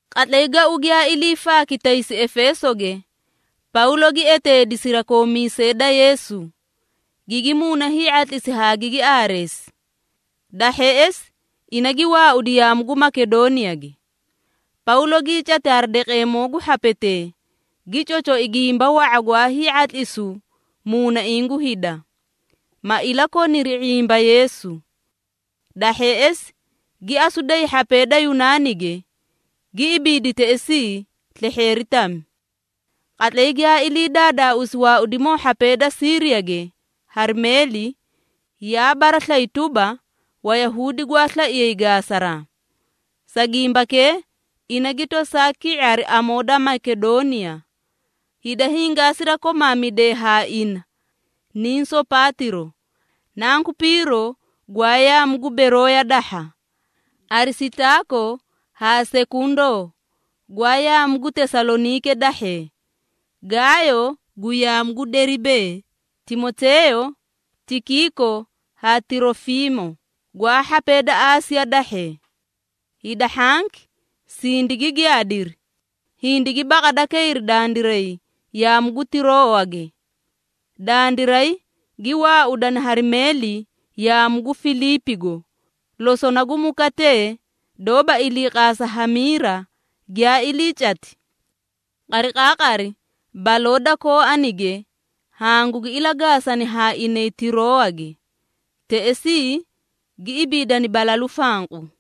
Qatlay gau giyaa ilii faaki taysi Efeesoge, Pawlo gi eteedi sirakoomiisee da Yeesu, gigi muuna hii⁄atlisi haa gigi aareesi. Da hheꞌesi ina gi waaudi yaamu gu Makedooniyage. Pawlo gii cati hari daqeemoo gu hhapetee, gi cocoi gimba wa⁄a gwaa hii⁄atlisu muunaiĩ gu hida, ma ilakoniri ⁄imba Yeesu. Da hheꞌesi, gi asu day hhapee da Yunaanige, gi ibiidi teꞌesii slehheeri tami. Qatlay giyaa ilii daadaausi waaudimoo hhapee da Siiriyage hari meeli, yaa baraslayi tuba, Wayahuudi gwaa slaiyay gaasaraa. Sa gimbakee ina gi tosaa ki⁄i hari amoo da Makedooniya. Hida hingaa sirakomamidee haa ina niĩ Sopaatiro, nanku Piiro gwaa yaamu gu Berooya dahha, Arisitaako haa Sekundoo gwaa yaamu gu Tesaloniike dahhee, Gaayo gu yaamu gu Deribee, Timoteeyo, Tikiiko haa Tirofiimo gwaa hhapee da Aasiya dahhee. Hida hhanki sindigi giyaadiri, hindigi baqada kayri dandiray yaamu gu Tiroowage. Dandiray gi waaudani hari meeli yaamu gu Filiipigo, losona gu mukaatee doóba iliiqaasa hamiira giyaa ilii cati. Qariqaaqari baloo da kooanige hangugi ilagaasani haa inay Tiroowage. Teꞌesii gi ibiidani balalu fanqu.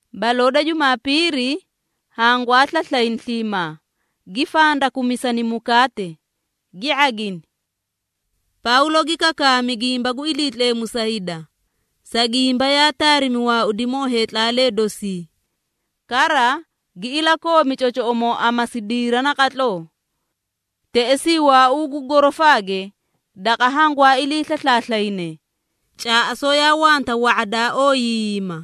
Baloo da Jumaapiiri, hangwaa slaslayni sliimaa, gi fandakumisani mukaate, gi ⁄agini. Pawlo gi kakaami gimba gu Iliitleemu sa hida, sa gimba yaa taarimi waaudimoo heetlaalee dosi, kara gi ilakoomi cocoꞌomoo amasidiira naqatloo. Teꞌesii waauu gu gorofaage daqa hangwaa ilii slaslaaslayne, caaꞌasoo yaa wanta wa⁄a daa ooyiiyima.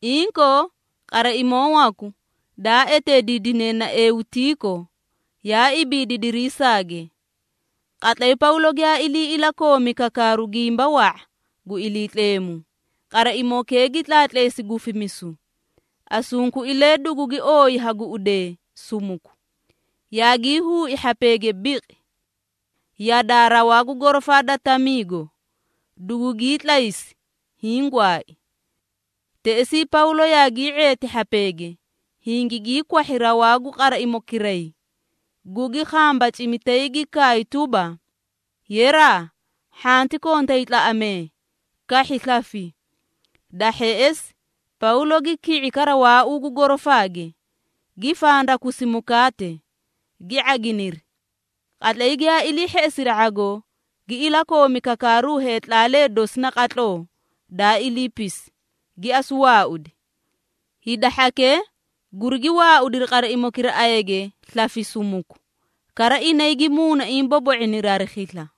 Inkoo, qaraimoo waku, daa eteediidine na Eutiiko, yaa ibiidi dirisaage. Qatlay Pawlo giyaa ilii ilakoomi kakaaru gimba wa⁄a gu Iliitleemu, qaraimokee gi tlaatleesi gufimisu, asunkuilee dugugi ooyi ha guꞌudee sumuku, yaagii huui hhapeege biqi! Yadaa rawaa gu gorofaa da tamiigo, dugugii tlaysi, hiĩ gwaai. Teꞌesii Pawlo yaagii ⁄eeti hhapeege, hingigii kwahhi rawaa gu qaraimokiray, gugi khambacimi tay gi kaay tuba, “Yeraa, hhanti kontay tlaꞌamee, kahhi slafi!” Da hheꞌesi Pawlo gi ki⁄i kara waauu gu gorofaage, gi fandakusi mukaate, gi ⁄aginiri. Qatlay giyaa ilii hheꞌesi ⁄agoo, gi ilakoomi kakaaru heetlaalee dosi naqatloo daa iliipisi, gi asu waaudi. Hida hhakee gurigi waaudiri qaraimokee ayage slafi sumuku, kara inay gi muunaiĩ bobo⁄iniri hari khisla.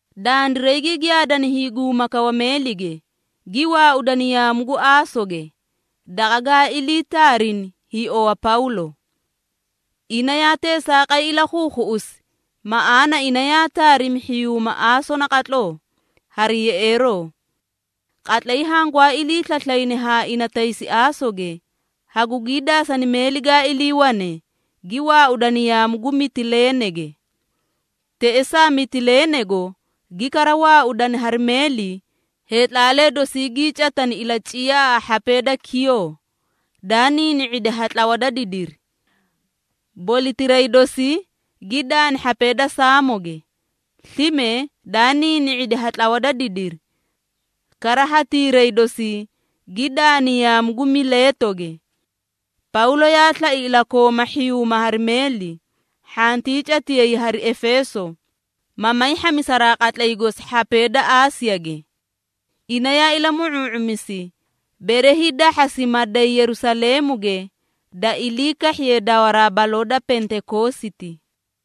Dandiray gi giyaadani hiiguma kawa meelige, gi waaudani yaamu gu Aasoge, daqa gaa ilii taarini hiiowa Pawlo. Ina yaa teesaaqay ilakhuukhuꞌusi, maꞌaana ina yaa taarimi hhiyuuma Aaso naqatloo hari yeꞌeeroo. Qatlay hangwaa ilii slaslayni haa ina taysi Aasoge, hagugii daasani meeli gaa iliiwane, gi waaudani yaamu gu Mitileenege. Teꞌesaa Mitileenego gi kara waaudani hari meeli, heetlaalee dosii gii catani ilaciyaa haa hhapee da Kiyoo, daa niini⁄idi ha tlawa da didiri. Bolitiray dosii gi daani hhapee da Saamoge, slime daa niini⁄idi ha tlawa da didiri, kara hatiiray dosii gi daani yaamu gu Mileetoge. Pawlo yaa slai ilakooma hhiyuuma hari meeli, hhantii catiyay hari Efeeso, ma may hhamisaraa qatlay gosi hhapee da Aasiyage. Ina yaa ilamu⁄uu⁄umisi, bere hiidahhasi, ma day Yerusaleemuge da ilii kahhiye dawaraa baloo da Pentekoositi.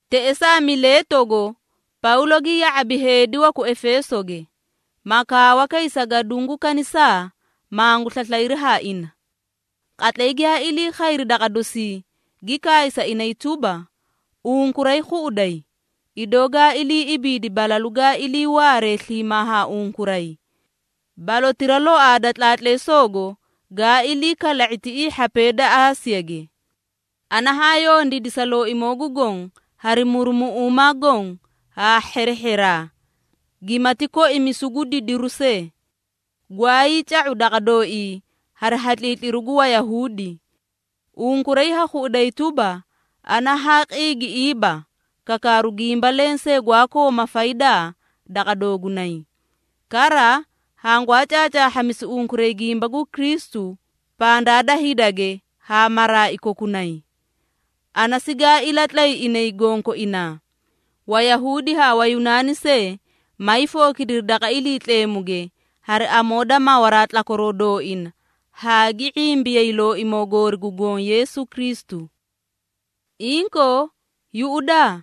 Teꞌesaa Mileetogo Pawlo gi ya⁄abi heedi waku Efeesoge, ma kaawa kay sa gaduũ gu kanisaa, mangu slaslayri haa ina. Qatlay giyaa ilii khayri daqa dosii, gi kaay sa inay tuba, “Unkuray khuꞌuday, idoo gaa ilii ibiidi balalu gaa iliiwaare sliimaa haa unkuray, balotira loaa da tlaatleesoogo gaa ilii kala⁄i tiꞌii hhapee da Aasiyage. Ana haa yondiidi sa Looimoo gu Goõ hari murumuꞌuumaa goõ haa hherehheraa, gimati koimisu gu didiru see, gwaayii ca⁄u daqa dooii hari hatliitliru gu Wayahuudi. Unkuray ha khuꞌuday tuba, ana haa qiigiꞌiiba kakaaru gimba lensee gwaa kooma faydaa daqa doogunay. Kara, hangwaa caacaahhamisi unkuray gimba gu Kristu pandaa da hidage haa maraai kokunay. Ana sigaa ilatlay inay gonkoinaa, Wayahuudi haa Wayunaani see, may fookidiri daqa Iliitleemuge hari amoo da mawaraa tlakwaroo dooina haa gi ⁄imbiyay Looimoo goori gu Goõ Yeesu Kristu. Inkoo, yuꞌudaa!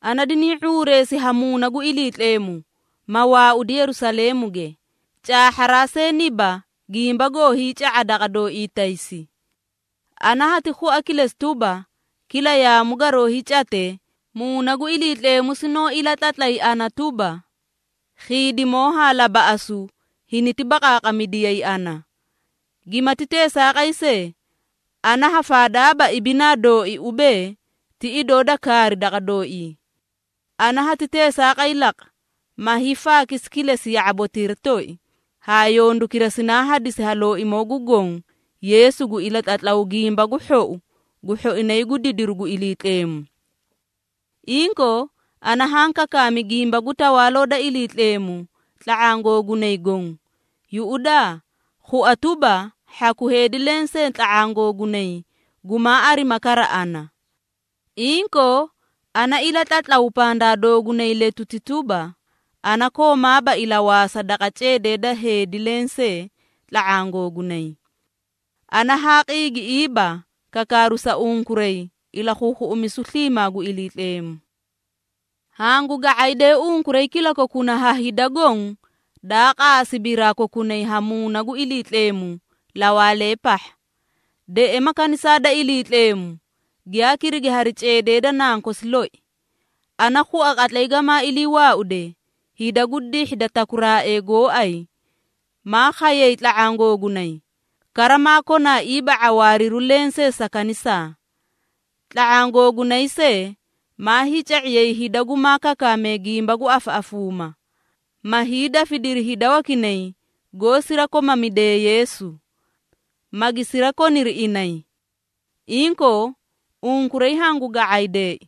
Ana diniĩ ⁄uureesi ha Muuna gu Iliitleemu, ma waaudi Yerusaleemuge, caahharaa see niba gimba goo hiica⁄a daqa dooii taysi. Ana hati khua kilesi tuba, kila yaamu garoo hiicate, Muuna gu Iliitleemu sinoó ilatlatlay ana tuba, khiidimoo haa labaꞌasu hiniti baqaaqamidiyayi ana. Gimati teesaaqay see, ana ha faadaaba ibinaa dooi ubee, ti idoo da kaari daqa dooii. Ana hati teesaaqay laqa, ma hiifaakisi kilesi ya⁄abotira toi haa yondukira sinaa hadisi ha Looimoo gu Goõ Yeesu gu ilatlatlaw Gimba gu Hhou gu hhoinay gu didiru gu Iliitleemu. Inkoo, ana haã kakaami gimba gu Tawaaloo da Iliitleemu tla⁄aã googunay goõ. Yuꞌudaa, khua tuba, hhaku heedi lensee tla⁄aã googunay gumaa arima kara ana. Inkoo, ana ilatlatlaw pandaa doogunay letuti tuba, ana koomaaba ilawaasa daqa ceedee da heedi lensee tla⁄aã googunay. Ana haa qiigiꞌiiba kakaaru sa unkuray ilakhuukhuꞌumisu sliimaa gu Iliitleemu. Hangu ga⁄aydee unkuray kilakokuna haa hida goõ daa qaasi biraa kokunay ha Muuna gu Iliitleemu lawaalee pahha. Deꞌema kanisaa da Iliitleemu, giyaa kirigi hari ceedee da nankosi loi. Ana khua qatlay gamaa iliiwaaude, hida gu dihhi da takuraaee gooay, maa khayay tla⁄aã googunay, kara maa konaaiiba ⁄awaariru lensee sa kanisaa. Tla⁄aã googunay see maa hiica⁄iyay hida gumaa kakaamee gimba gu afaꞌafuuma, ma hiidafidiri hida wakinay goó sirakomamidee Yeesu, magi sirakoniri inay. Inkoo, unkuray hangu ga⁄aydee!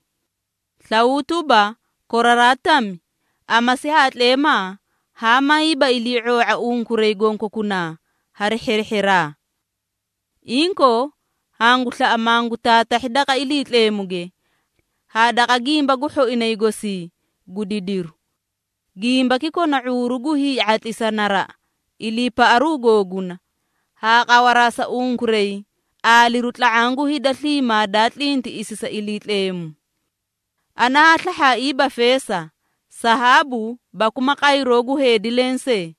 Slawuu tuba, koraraa tami, amasi haa tleemaa haa mayiiba ilii⁄oo⁄a unkuray gonkokunaa hari hherehheraa. Inkoo, hangu slaꞌa mangu taatahhi daqa Iliitleemuge haa daqa gimba gu hhoinay gosii gu didiru. Gimbaki kona ⁄uuru gu hii⁄atlisa naraꞌa iliipaꞌaru googuna haa qawaraa sa unkuray aaliru tla⁄aã gu hida sliimaa daa tlintiꞌisi sa Iliitleemu. Ana haa slahhaaiiba feesa, sahaabu baku ma qayroo gu heedi lensee.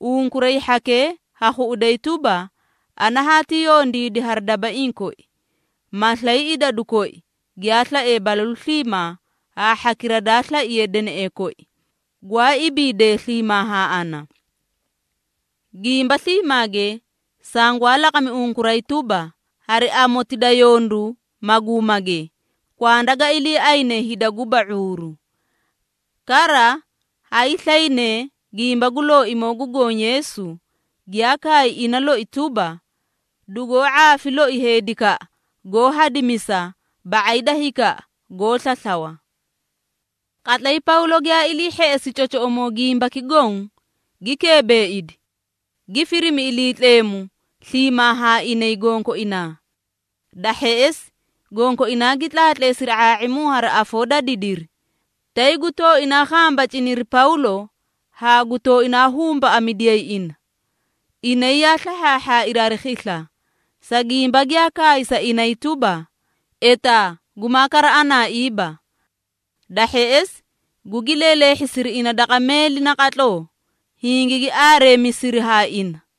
Unkuray hhakee ha khuꞌuday tuba, ana haati yondiidi hari dabaiĩ koi, ma slay idadu koi giyaa slae balalu sliimaa haa hhakira daa slaiye deneꞌee koi, gwaa ibiidee sliimaa haa ana. Gimba sliimaage, sangwaa laqami unkuray tuba, hari amoti da yondu maguumage, kwanda ga iliiayne hida guba ⁄uuru. Kara hayslaynee gimba gu Looimoo gu Goõ Yeesu, giyaa kaay ina loi tuba, ‘Dugoó ⁄aafi loi heedikaꞌa goó hadimisa, ba⁄ay da hikaꞌa goó slaslawa.’” Qatlay Pawlo giyaa ilii hheꞌesi cocoꞌomoo gimbaki goõ, gi keebeeidi, gi firimi Iliitleemu sliimaa haa inay gonkoinaa. Da hheꞌesi, gonkoinaa gi tlaatleesiri ⁄aa⁄imu hari afoo da didiri, tay gu tooinaa khambaciniri Pawlo haa gu tooinaa humbaꞌamidiyay ina. Inay yaa slahhaahhaairi hari khisla, sa gimba giyaa kaay sa inay tuba, etaa gumaa kara anaaiiba. Da hheꞌesi gugi leeleehhisiri ina daqa meeli naqatloo, hingigi aareemisiri haa ina.